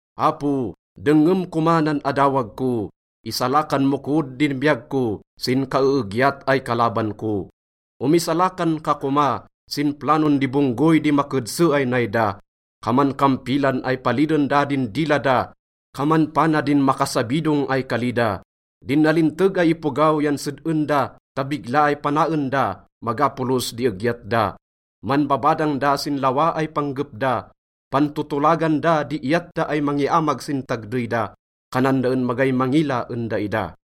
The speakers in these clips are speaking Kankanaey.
Apo, dengngem koma nan adawag ko, isalakan mo kod din biyag ko sin kaeegyat ay kalaban ko. Omisalakan ka koma sin planon di bonggoy di makedse ay nay da. Kaman kampilan ay paliden da din dila da, kaman pana din makasabidong ay kali da. Din nalinteg ay ipogaw yan sed-en da ta bigla ay panaen da, maga polos di egyat da. Manbabadang da sin lawa ay panggep da, pantotolagan da di iyat da ay mangiamag sin tagdey da. Kanan da en magay mangila en daida.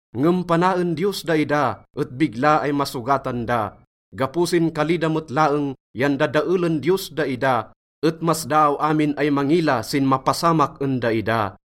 Ngem panaen Diyos daida et bigla ay masogatan da. Gapo sin kali da met laeng yan dadaelen Diyos daida, et masdaaw amin ay mangila sin mapasamak en daida.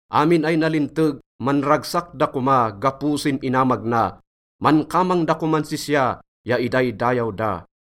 Amin ay nalinteg, manragsak da koma gapo sin inamag na. Mankamang da koman sisya ya idaydayaw da.